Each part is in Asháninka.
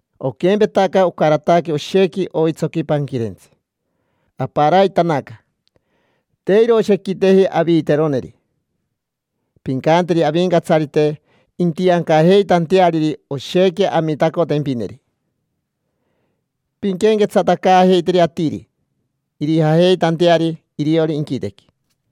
Oquempetaca ocarataque oshequi oitsoqui panquirentsi, aparaitanaca: te iroshequiteji aviiteroneri. Pincanteri Avincatsarite intiancajeitanteariri oshequi amitacotempineri pinquenquetsatacaajeiteri atiri, irijajeitanteari iriori inquitequi.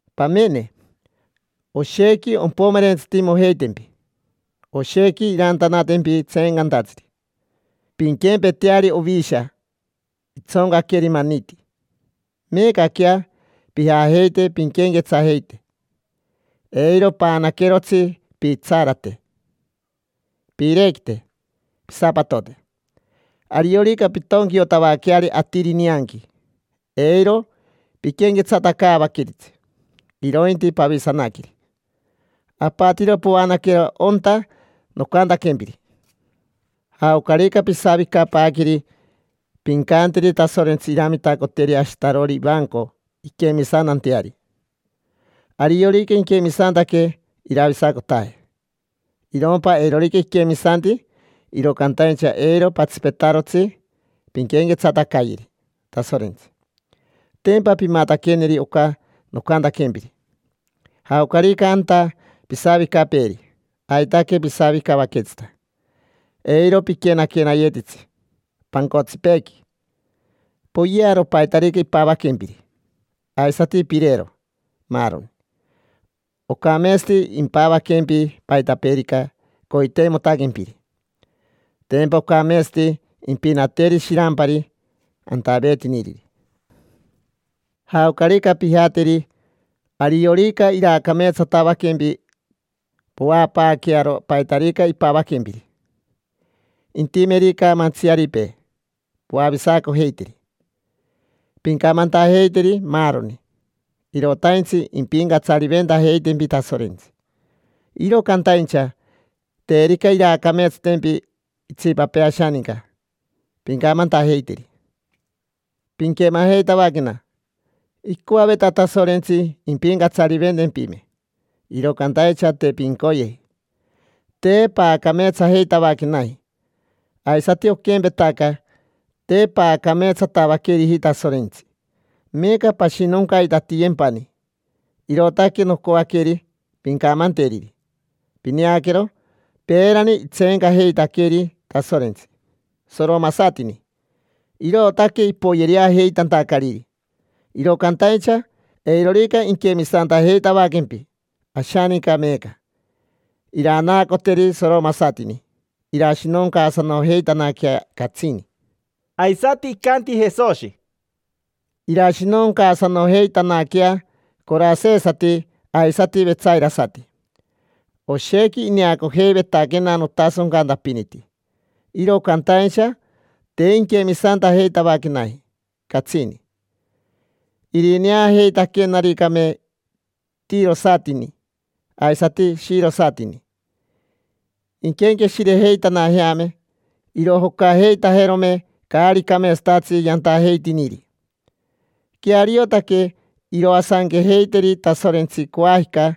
Pamene, oshequi ompomerentsitimojeitempi, oshequi irantanatempi tseencantatsiri: pinquempeteari ovisha, itsoncaqueri maniti. Meecaquea, pijajeite pinquenquetsajeite. Eiro paanaquerotsi pitsarate, piirequite, pisapatote. Ariorica pintonquiotavaqueari atiri nianqui, eiro piquenquetsatacaavaqueritsi, irointi pavisanaqueri: apatiro povaanaquero onta nocantaquempiri. Jaocarica pisavicapaaqueri, pincanteri Tasorentsi iramitacoteri ashitarori ivanco inquemisantanteari. Ariorica inquemisantaque, iravisacotaje. Irompa eirorica iquemisanti, iro cantaincha eiro patsipetarotsi pinquenquetsatacayeri Tasorentsi: tempa pimataqueneri oca nocantaquempiri. Jaocarica anta pisavicapeeri, aitaque pisavicavaquetsita. Eiro piquenaquenayetitsi pancotsipeequi. Poyearo paitarica impavaquempiri, aisati pirero, maaroni. Ocameetsati impavaquempi paitapeerica coiteimotaquempiri: tempa ocameetsati impinateri shirampari antaveetiniriri. Jaocarica pijateri, ariorica iraacameetsatavaquempi, poapaaquearo paitarica impavaquempiri. Intimerica mantsiaripee, poavisacojeiteri. Pincamantajeiteri maaroni: “Irotaintsi impincatsariventajeitempi Tasorentsi”. Iro cantaincha terica iraacameetsatempi itsipapee ashaninca, pincamantajeiteri: “Pinquemajeitavaquena: icoaveta Tasorentsi impincatsariventempime, iro cantaincha te pincoyeji. Te paacameetsajeitavaquenaji, aisati oquempetaca, te paacameetsatavaqueriji Tasorentsi. Meeca pashinoncaitatiyempani”. Irootaque nocoaqueri pincamanteriri. Pineaquero, peerani itseencajeitaqueri Tasorentsi soromasatini, irootaque ipoyereajeitantacariri. Iro cantaincha eirorica inquemisantajeitavaquempi ashaninca meeca, iranaacoteri soromasatini, irashinoncaasanojeitanaquea catsini. Aisati icanti Jesoshi: —Irashinoncaasanojeitanaquea corasesati aisati vetsairasati: oshequi ineacojeivetaquena notasoncantapiniti, iro cantaincha te inquemisantajeitavaquenaji catsini. Irineajeitaquenaricame tirosatini aisati shirosatini, inquenqueshirejeitanajeame, irojocajeitajerome caari cameetsatatsi yantajeitiniri. Queariotaque iroasanquejeiteri Tasorentsi coajica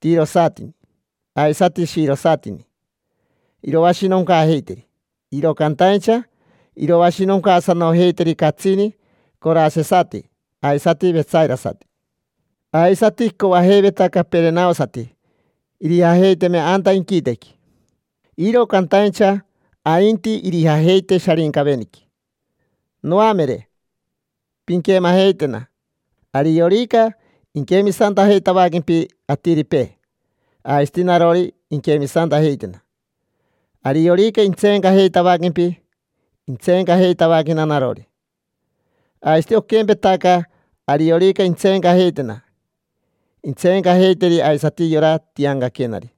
tirosatini aisati shirosatini, iroashinoncaajeiteri, iro cantaincha iroashinoncaasanojeiteri catsini corasesati aisati vetsairasati. Aisati icoajeiveta caperenaosati irijajeiteme anta inquitequi, iro cantaincha ainti irijajeite Sharincaveniqui. Noamere, pinquemajeitena. Ariorica inquemisantajeitavaquempi atiripee, aisati narori inquemisantajeitena. Ariorica intseencajeitavaquempi, intseencajeitavaquena narori. Aisati oquempetaca, ariorica intseencajeitena, intseencajeiteri aisati yora tiancaquenari.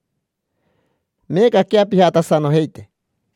Meecaquea, pijatasanojeite.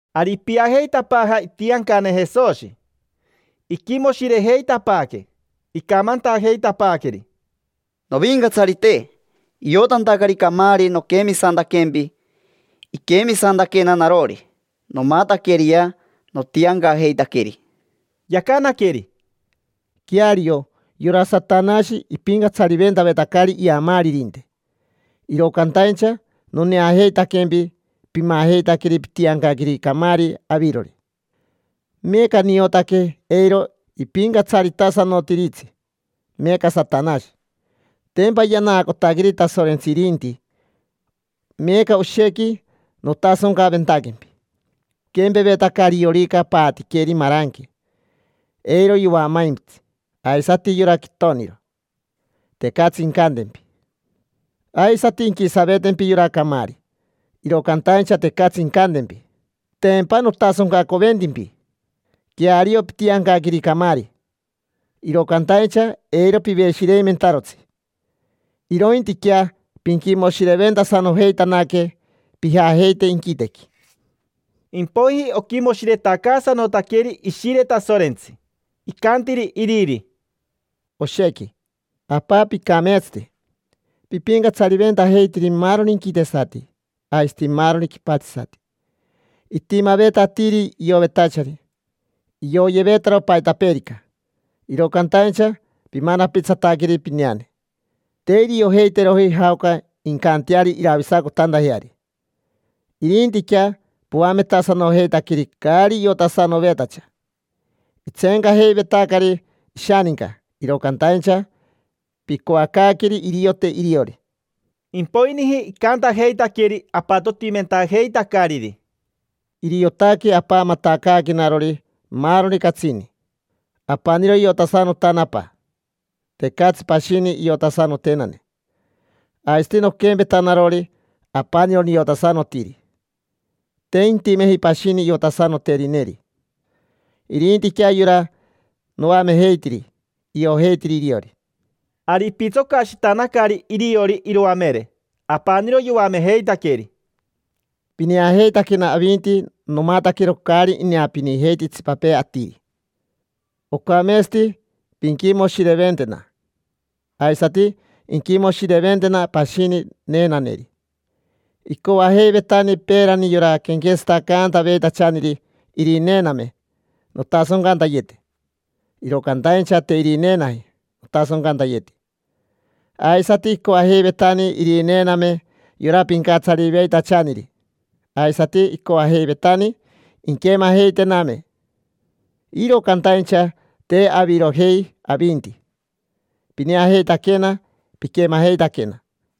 Ari ipiajeitapaaja itiancane Jesoshi, iquimoshirejeitapaaque. Icamantajeitapaaqueri: —Novincatsarite, iotantacari camaari noquemisantaquempi, iquemisantaquena narori. Nomataqueriquea notiancajeitaqueri. Yacanaqueri: —Queario yora Satanashi ipincatsariventavetacari iamaaririnte, iro cantaincha noneajeitaquempi pimajeitaqueri pitiancaqueri camaari avirori: meeca niotaque eiro ipincatsaritasanotiritsi meeca Satanashi, tempa yanaacotaqueri Tasorentsi irinti. Meeca oshequi notasoncaventaquempi: oquempevetaca ariorica paatiqueri maranque, eiro yoamaimpitsi; aisati yora quitoniro, tecatsi incantempi. Aisati inquisavetempi yora camaari, iro cantaincha tecatsi incantempi, tempa notasoncacoventimpi. Queario pitiancaqueri camaari, iro cantaincha eiro piveshireimentarotsi. Irointiquea pinquimoshireventasanojeitanaque pijajeite inquitequi. Impoiji oquimoshiretacaasanotaqueri Ishire Tasorentsi, icantiri iriri: —Oshequi, apa, picameetsati. Pipincatsariventajeitiri maaroni inquitesati aisati maaroni quipatsisati. Itimaveta atiri iovetachari, ioyevetaro paitapeerica, iro cantaincha pimanapitsataqueri pineane: te iriojeiteroji jaoca incanteari iravisacotantajeari. Irintiquea poametasanojeitaqueri caari iotasanovetacha: itseencajeivetacari ishaninca, iro cantaincha picoacaaqueri iriote iriori. Impoiniji icantajeitaqueri apatotimentajeitacariri: —Iriotaque Apa matacaaquenarori maaroni catsini. Apaniro iotasanotana Apa, tecatsi pashini iotasanotenane. Aisati noquempeta narori, apaniro niotasanotiri, te intimeji pashini iotasanoterineri: irintiquea yora noamejeitiri, iojeitiri iriori. Ari ipitsocashitanacari iriori iroamere, apaniro yoamejeitaqueri: —Pineajeitaquena avinti nomataquero caari ineapinijeiti itsipapee atiri. Ocameetsati pinquimoshireventena, aisati inquimoshireventena pashini neenaneri. Icoajeiveitani peerani yora quenquetsatacantaveitachaniri irineename nontasoncantayete, iro cantaincha te irineenaji notasoncantayeti. Aisati icoajeiveitani irineename yora pincatsariyeveitachaniri. Aisati icoajeiveitani inquemajeitename, iro cantaincha, te. Avirojei avinti, pineajeitaquena, piquemajeitaquena.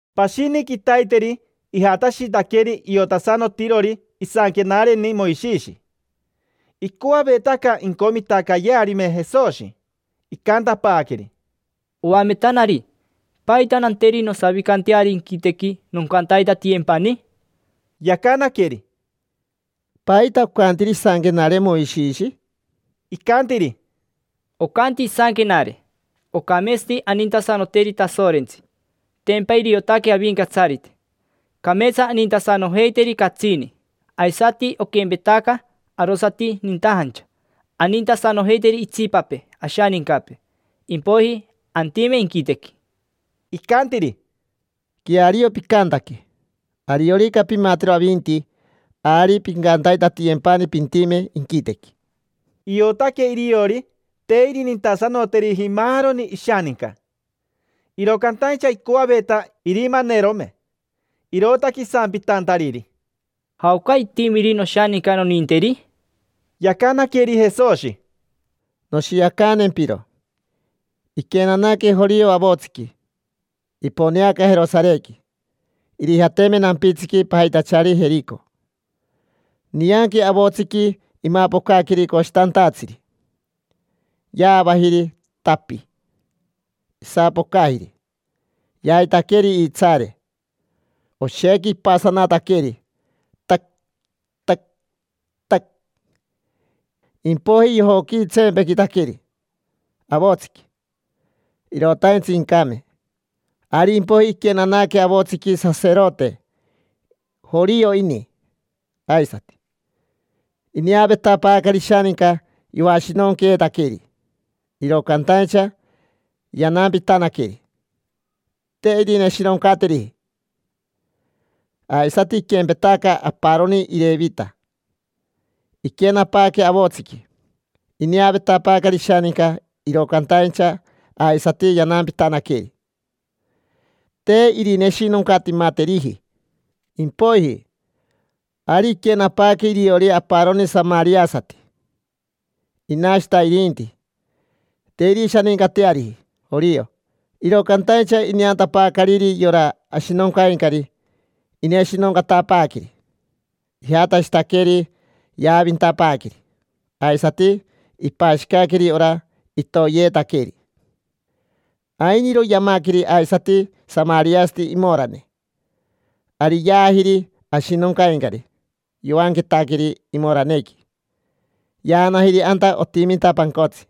Pashini quitaiteri ijatashitaqueri iotasanotirori isanquenareni Moishishi. Icoavetaca incomitacayearime Jesoshi; icantapaaqueri: —Oametanari, ¿paita nanteri nosavicanteari inquitequi, noncantaitatiyempani? Yacanaqueri: —¿Paita ocantiri isanquenare Moishishi? Icantiri: —Ocanti isanquenare: “Ocameetsati anintasanoteri Tasorentsi: tempa iriotaque Avincatsarite. Cameetsa anintasanojeiteri catsini. Aisati oquempetaca arosati nintajancha, anintasanojeiteri itsipapee ashanincapee, impoiji antime inquitequi”. Icantiri: —Queario picantaque: ariorica pimatero avinti, ari pincantaitatiyempani pintime inquitequi. Iotaque iriori te irinintasanoteriji maaroni ishaninca, iro cantaincha icoaveta irimanerome. Irootaque isampitantariri: —¿Jaoca itimiri noshaninca noninteri? Yacanaqueri Jesoshi: —Noshiacantempiro. Iquenanaque jorio avotsiqui. Iponeaca Jerosarequi, irijateme nampitsiqui pajitachari Jerico. Nianqui avotsiqui imapocaqueri coshitantatsiri, yaavajiri, tapi. Isapocajiri, yaitaqueri iitsaare, oshequi ipasanataqueri, tac, tac, tac. Impoiji yojoquitsempequitaqueri avotsiqui, irotaintsi incame. Ari impoiji iquenanaque avotsiqui saserote; jorio ini aisati. Ineavetapaacari ishaninca yoashinonqueetaqueri, iro cantaincha yanampitanaqueri, te irineshinoncateriji. Aisati iquempetaca aparoni Irevita, iquenapaaque avotsiqui. Ineavetapaacari ishaninca, iro cantaincha aisati yanampitanaqueri, te irineshinoncatimateriji. Impoiji, ari iquenapaaque iriori aparoni samariasati. Inashita irinti, te irishanincateariji jorio. Iro cantaincha ineantapaacariri yora ashinoncaincari, ineshinoncatapaaqueri. Ijatashitaqueri, yaavintapaaqueri, aisati ipashicaqueri ora itoyeetaqueri. Ainiro yamaqueri aisati samariasati imorane. Ari yaajiri ashinoncaincari, yoanquetaqueri imoranequi, yaanajiri anta otiminta pancotsi.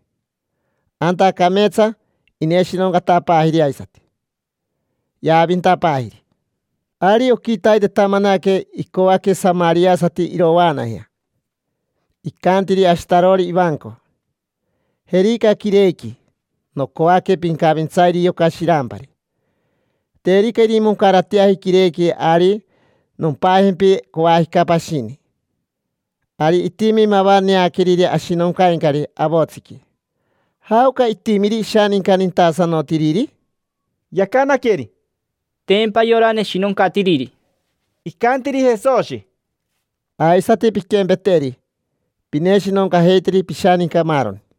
Anta cameetsa ineshinoncatapaajiri aisati, yaavintapaajiri. Ari oquitaitetamanaque icoaque samariasati irovaanajea. Icantiri ashitarori ivanco: “Jerica quirequi. Nocoaque pincavintsayeri yoca shirampari. Terica irimoncarateaji quirequi, ari nompajempi coajica pashini”. Ari itimi mava neaqueriri ashinoncaincari avotsiqui. ¿Jaoca itimiri ishaninca nintasanotiriri? Yacanaqueri: —Tempa yora neshinoncatiriri. Icantiri Jesoshi: —Aisati pinquempeteri, pineshinoncajeiteri pishaninca, maaroni.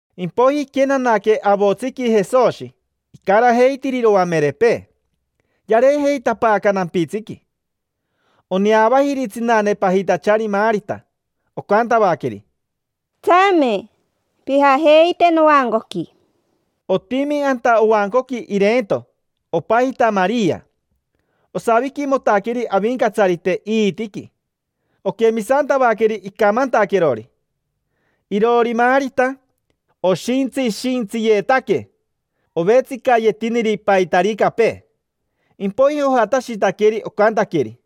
Impoiji iquenanaque avotsiqui Jesoshi, icarajeitiri iroamerepee. Yareejeitapaaca nampitsiqui. Oneavajiri tsinane pajitachari Marita, ocantavaqueri: —Tsame, pijajeite novancoqui. Otimi anta ovancoqui ireento, opajita Maria. Osaviquimotaqueri Avincatsarite iitiqui, oquemisantavaqueri icamantaquerori. Iroori Marita, oshintsishintsiyetaque, ovetsicayetiniri paitaricapee. Impoiji ojatashitaqueri, ocantaqueri: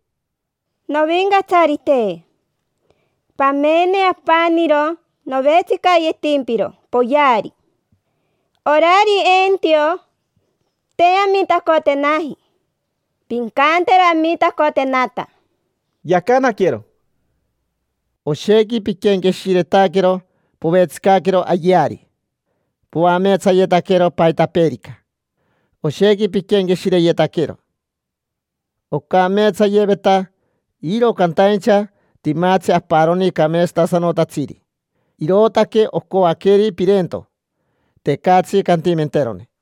—Novincatsarite, pamene apaniro novetsicayetimpiro poyeari. Orari eentio, te amitacotenaji. Pincantero amitacotenata. Yacanaquero: —Oshequi piquenqueshiretaquero povetsicaquero ayeari, poameetsayetaquero paitapeerica. Oshequi piquenqueshireyetaquero. Ocameetsayeveta, iro cantaincha timatsi aparoni cameetsasanotatsiri: irootaque ocoaqueri pireento, tecatsi cantimenterone.